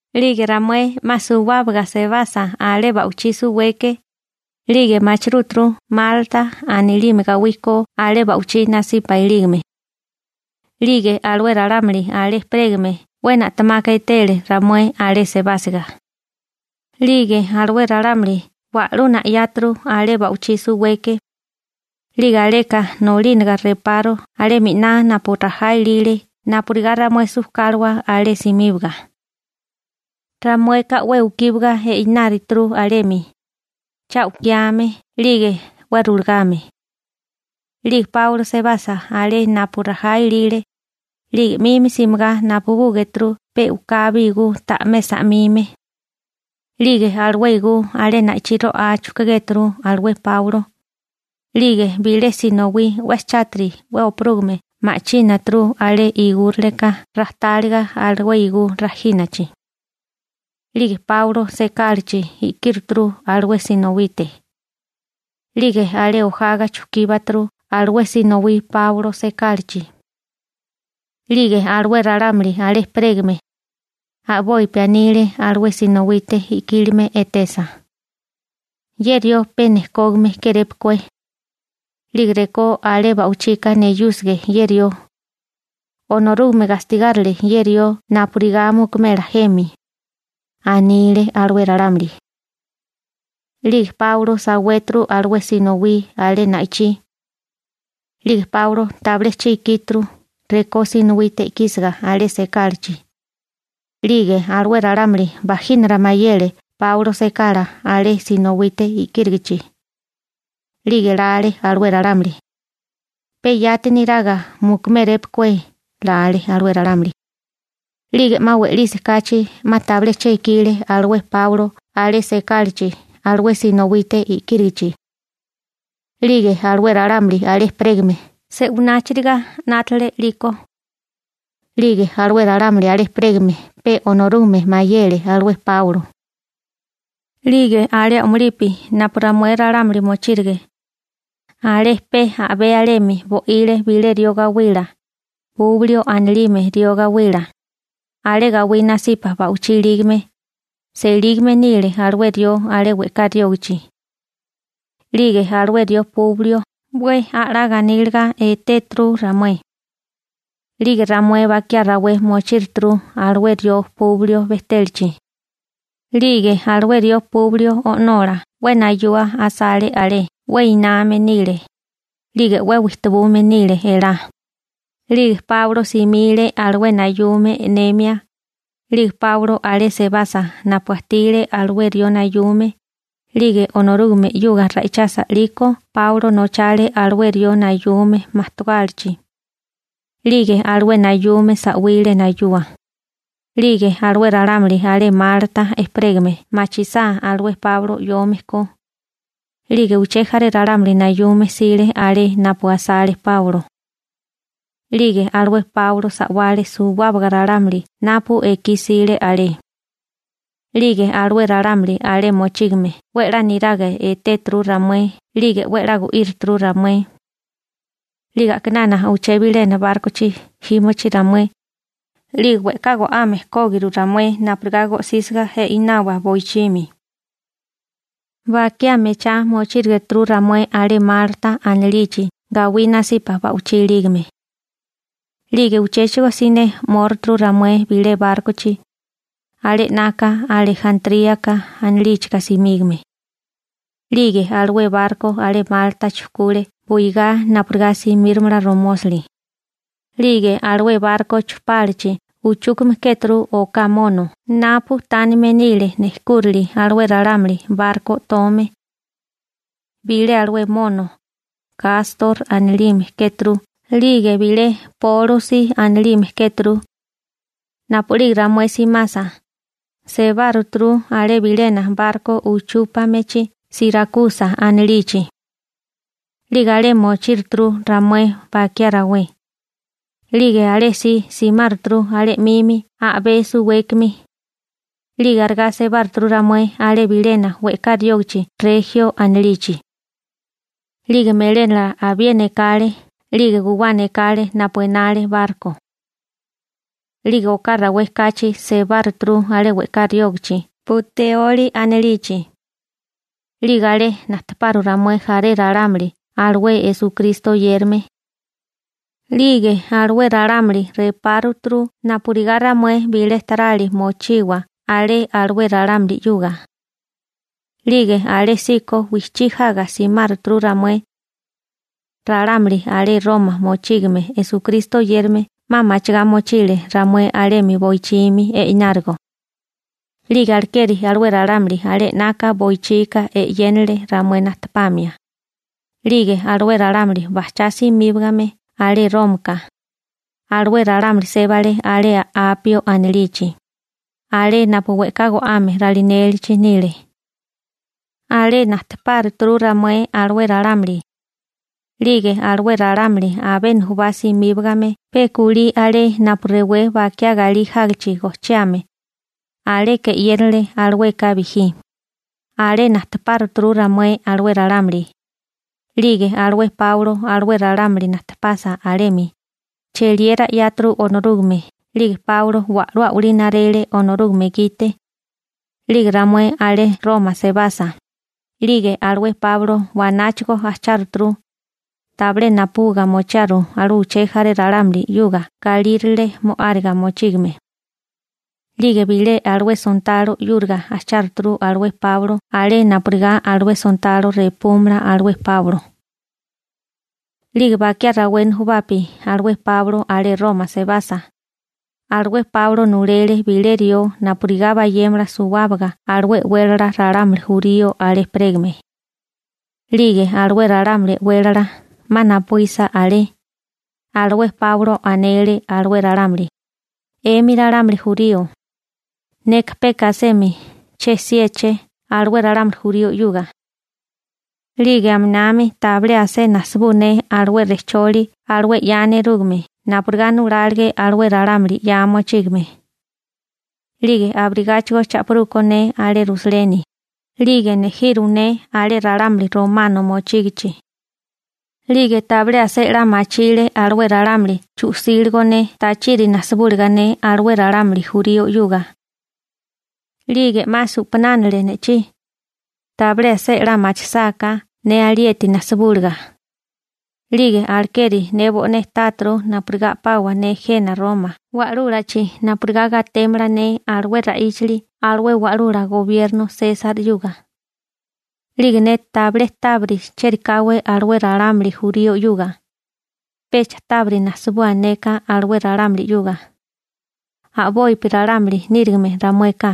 'Lige ramué 'ma suwábaga sebasa alé ba'wichí suweke, 'lige machirúturu Malta anilime gawí ko alé ba'wichí nasipa ilígame. 'Lige alué ralámuli alé ejperégame 'we na'temaka etele ramué alé sebásiga. 'Lige alué ralámuli wa'lú na'yáturu alé ba'wichí suweke. 'Lige aleka nolínaga reparu alé miná napu rajá ilile napurigá ramué sujkáliwa alé simíbaga. Ramueka 'we ukíwaga eináruturu alemi, cha u'kiame 'lige 'we rulagame. 'Lige Páulo sebasa alé napu rajá ilile, 'lige 'minami simigá napubúgéturu pe u'kabi igú ta'mé sa'mime. 'Lige alué igú alé na'ichí ro'á chujkugéturu alué Páulo, 'lige bilé sinowí 'we chátiri 'we oparúgame ma'chínaturu alé igúraleka rajtáliga alué igú rajínachi. 'Lige Páulo sekálachi i'kíruturu alué sinowite. 'Lige alé ojaga chujkíbaturu alué sinowí Páulo sekálachi. 'Lige alué ralámuli alé ejperégame, a'bopi anile alué sinowite i'kílime etesa: ―Ye rió pe nejkógame kérépukué, 'lige rekó alé ba'wichika neyúsige ye rió, Onorúgame gastigárile ye rió napurigá mukumela jemi ―anile alué ralámuli. 'Lige Páulo sawéturu alué sinowí alé na'ichí. 'Lige Páulo tabilé che ikíturu rekó sinowite i'kísiga alé sekálachi. 'Lige alué ralámuli bajínara mayele Páulo sekala alé sinowite i'kírigichi. 'Lige lale alué ralámuli: «Pe yati niraga mukumérépukué», lale alué ralámuli. 'Lige 'ma we'lisi kachi 'ma tabilé che ikile alué Páulo alé sekálachi alué sinowite i'kírigichi. 'Lige alué ralámuli alé ejperégame se'wináchiriga 'nátale 'liko. 'Lige alué ralámuli alé ejperégame pe Onorúgame mayele alué Páulo. 'Lige alé a'mulipi napu ramué ralámuli mochírige, alé pe a'bé alemi bo'ile bilé rió gawila, Publio anilime rió gawila. Alé gawí nasipa ba'wichí ilígame, selígame nile alué rió alé we'ká riógachi. 'Lige alué rió Publio 'we a'lá ganíliga etéturu ramué. 'Lige ramué bakiá rawé mochíruturu alué rió Publio bejtélachi. 'Lige alué rió Publio o'nola 'we nayua asale alé, 'we iname nile, 'lige 'we wijtabume nile elá. 'Lige Páulo simile alué nayume e'nemia. 'Lige Páulo alé sebasa napu ajtile alué rió nayume, 'lige Onorúgame 'yuga ra'ichasa 'liko Páulo nochale alué rió nayume majtogálachi. 'Lige alué nayume sa'wile nayua. 'Lige alué ralámuli alé Malta ejperégame machisá alué Páulo 'yome ko, 'lige uché jaré ralámuli nayume jsile alé napu asale Páulo. 'Lige alué Páulo sa'wale suwábaga ralámuli napu ekí jsile alé. 'Lige alué ralámuli alé mochígame 'we 'la niraga etéturu ramué 'lige 'we 'la gu'írituru ramué. 'Lige a'kinana uché bilena bárkochi jímochi ramué, 'lige we'ká go'ame kógiru ramué napurigá go'sísiga i'nawa boichimi. Bakiá mechá mochírigituru ramué alé Malta anilichi gawí nasipa ba'wichí ilígame. 'Lige uchéchigo siné 'móruturu ramué bilé bárkochi, alé 'naka Alejantríaka anilíchika simígame. 'Lige alué barko alé Malta chujkule buigá napurigá simíromala romósali. 'Lige alué barko chupálachi uchúkame kéturu oká mono napu tánime nile nejkúrale alué ralámuli barko o'tome. Bilé alué mono, Kastor anilime kéturu 'lige bilé Pólusi anilime kéturu. Napu'lige ramué simasa, sebáruturu alé bilena barko uchúpamechi Sirakusa anilichi. 'Lige alé mochíruturu ramué bakiá rawé. 'Lige alésí simáruturu alé 'mimi a'bé suwékimi. 'Lige arigá sebáruturu ramué alé bilena we'ká riógichi Rejio anilichi. 'Lige melénala abiena ekale 'lige guwana ekale napu enale barko. 'Lige oká rawé kachi sebáruturu alé we'ká riógichi Puteoli anilichi. 'Lige alé najtepáruturu ramué jaré ralámuli alué Esukristo oyérame. 'Lige alué ralámuli repáruturu napurigá ramué bilé tarali mochiwa alé alué ralámuli 'yuga. 'Lige alésíko wijchí jaga simáruturu ramué. Ralámuli alé Roma mochígame Esukristo oyérame 'ma machigá mochile ramué alemi boichimi i'nárigo. 'Lige alekeri alué ralámuli alé 'naka boichika e'yénele ramué najtepamia. 'Lige alué ralámuli bajchá simíbagame alé Rómaka, alué ralámuli sébale alé Apio anilichi, alé napu we'ká go'ame ralinélichi nile. Alé najtepáruturu ramué alué ralámuli. 'Lige alué ralámuli abé nujubá simíbagame pe kulí alé napu rewé Bakiá Galí Jágichi Gojchiame, aleka e'yénele alueka bijí, alé najtepáruturu ramué alué ralámuli. 'Lige alué Páulo alué ralámuli najtepasa alemi, cheliera 'yáturu Onorúgame 'lige Páulo wa'lú a'walí narele Onorúgame gite. 'Lige ramué alé Roma sebasa, 'lige alué Páulo wanáchigo ajcháruturu. Tabilé napubuga mochiaru alué uché jaré ralámuli 'yuga galírale mo'áriga mochígame. 'Lige bilé alué sontalo 'yúriga ajcháruturu alué Páulo alé napurigá alué sontalo repúmala alué Páulo. 'Lige bakiá rawé nujubapi alué Páulo alé Roma sebasa, alué Páulo nulele bilé rió napurigá bayémala suwábaga alué e'wélala ralámuli jurío alé ejperégame. 'Lige alué ralámuli e'wélala, 'ma napuísa alé, alué Páulo anele alué ralámuli: ―'Emi ralámuli jurío, neka peka asemi che 'siéché alué ralámuli jurío 'yuga. 'Lige aminami tabilé asé nasibú ne alué rejcholi alué 'ya nerúgame napurigá nulálige alué ralámuli 'ya mochígame. 'Lige abirigáchigo cha'pirú ko ne alé Rusaleni, 'lige nejiru ne alé ralámuli romano mochígichi. 'Lige tabilé asé 'la machile alué ralámuli chu'síligo ne tachiri najsibúliga ne alué ralámuli jurío 'yuga. 'Lige 'ma su'panánale ne'chí, tabilé asé 'la machisáká ne alieti najsibúliga. 'Lige alekeri ne bo'né táturu napurigá a'pawa ne jena Roma wa'lúlachi napurigá gatémala ne alué ra'íchali alué wa'lula gobierno Sesar 'yuga. 'Lige ne tabilé tábiri chérikáwé alué ralámuli jurío 'yuga, pecha tábiri najsibua neka alué ralámuli 'yuga, a'bopi ralámuli nírigime ramueka.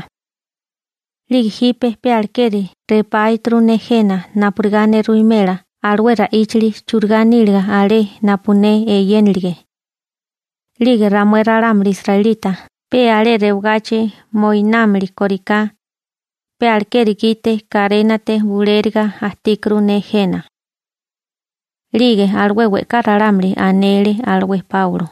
'Lige jipe pe alekeri repáituru ne jena napurigá ne ruwimela alué ra'íchili churigá níliga alé napu ne eyénilige. 'Lige ramué ralámuli israelita pe alé rewagachi moinámili kóriká, pe alekeri gite karénate bulériga ajtíkuru ne jena. 'Lige alué we'ká ralámuli anele alué Páulo: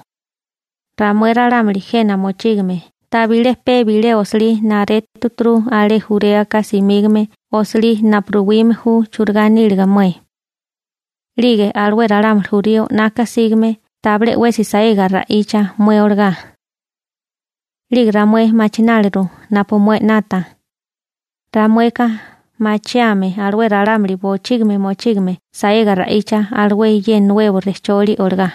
―Ramué ralámuli jena mochígame tabilé pe bilé osilí naretu alé Juréaka simígame osilí napu ruwime ju churigá nílige mué. 'Lige alué ralámuli jurío 'naka sígame tabilé 'wesi saega ra'icha mué olagá. 'Lige ramué machináliru napu mué 'nata. Ramueka machiame alué ralámuli bochígimi mochígame saega ra'icha alué ye nuebo rejcholi olagá.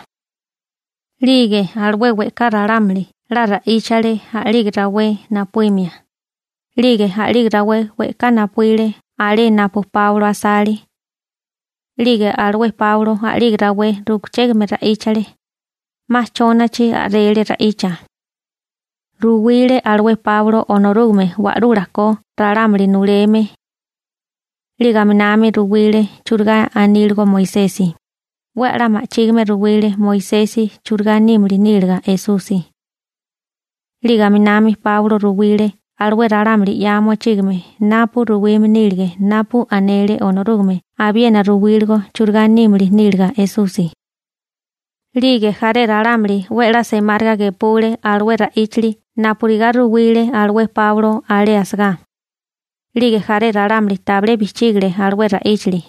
'Lige alué we'ká ralámuli 'la ra'íchale a'lige rawé napuímia. 'Lige a'lige rawé we'ká napuíle alé napu Páulo asale. 'Lige alué Páulo a'lige rawé ru'kuchégame ra'íchale. 'Ma chónachi a'rele ra'icha. Ruwile alué Páulo Onorúgame Wa'lula ko ralámuli nuleme. 'Lige aminami ruwile churigá aníligo Moisesi, 'we a'lá ma'chígime ruwile Moisesi churigá nímili níliga Esusi. 'Lige aminami Páulo ruwile alué ralámuli 'ya mochígame napu ruwime nílige napu anele Onorúgame abiena ruwíligo churigá nímili níliga Esusi. 'Lige jaré ralámuli 'we a'lá semáriga gepule alué ra'íchali napurigá ruwile alué Páulo alé asagá. 'Lige jaré ralámuli tabilé bijchígile alué ra'íchali.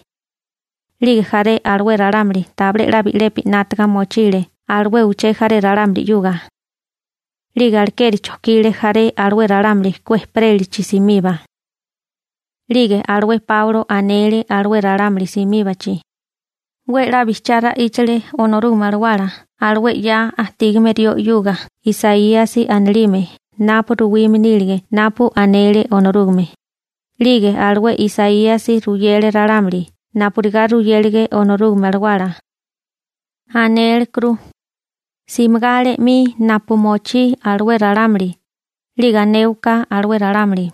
'Lige jaré alué ralámu tabilé 'la bi'lepi 'nátaga mochile alué uché jaré ralámuli 'yuga. 'Lige alekeri chojkile jaré alué ralámuli ku ejperélachi simiba. 'Lige alué Páulo anele alué ralámuli simíbachi: ―'We 'la bijchiá ra'íchale Onorúgame Alawala alué 'ya ajtígame rió 'yuga Isaíasi anilime napu ruwime nílige napu anele Onorúgame, 'lige alué Isaíasi ruyele ralámuli napurigá ruyélige Onorúgame Alawala. Anélekuru: Simigá alé 'mi napu mochí alué ralámuli 'lige anéwaká alué ralámuli: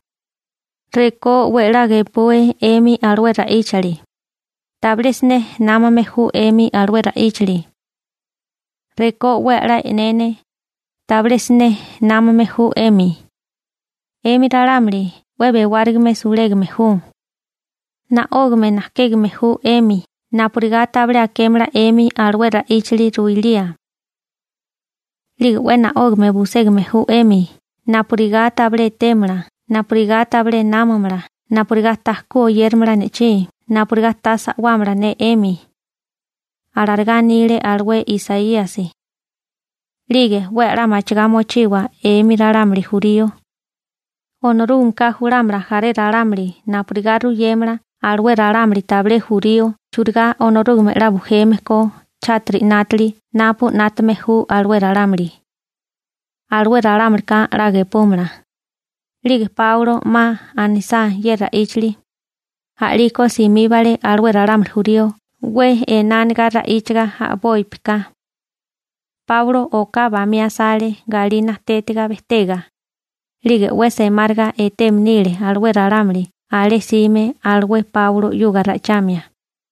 Rekó 'we 'la gepue 'emi alué ra'íchali, tabilé siné námame ju 'emi alué ra'íchili. Rekó 'we a'lá e'nene, tabilé siné námame ju 'emi napu eté. 'Emi ralámuli 'we bewárigame sulégame ju. Na'ógame najkégame ju 'emi napurigá tabilé akémala 'emi alué ra'íchili ruilía. 'Lige 'we na'ógame buségame ju 'emi napurigá tabilé etémala napurigá tabilé námamala napurigá ta ku oyéramala ne'chí napurigá ta sa'wámala ne 'emi. Alarigá anile alué Isaíasi. 'Lige 'we a'lá machigá mochiwa 'emi ralámuli jurío. Onorúgameka julámala jaré ralámuli napurigá ruyémala alué ralámuli tabilé jurío churigá Onorúgame 'la bujeme ko chátiri 'nátali napu 'nátame ju alué ralámuli. Alué ralámulika 'la gepúmala. 'Lige Páulo 'ma anisá ye ra'íchali, a'liko simíbale alué ralámuli jurío 'we enániga ra'íchaga a'bópika. Páulo oká bamí asale galí najtétiga bejtega, 'lige 'we semáriga eteme nile alué ralámuli alé jsime alué Páulo 'yuga ra'ichamia.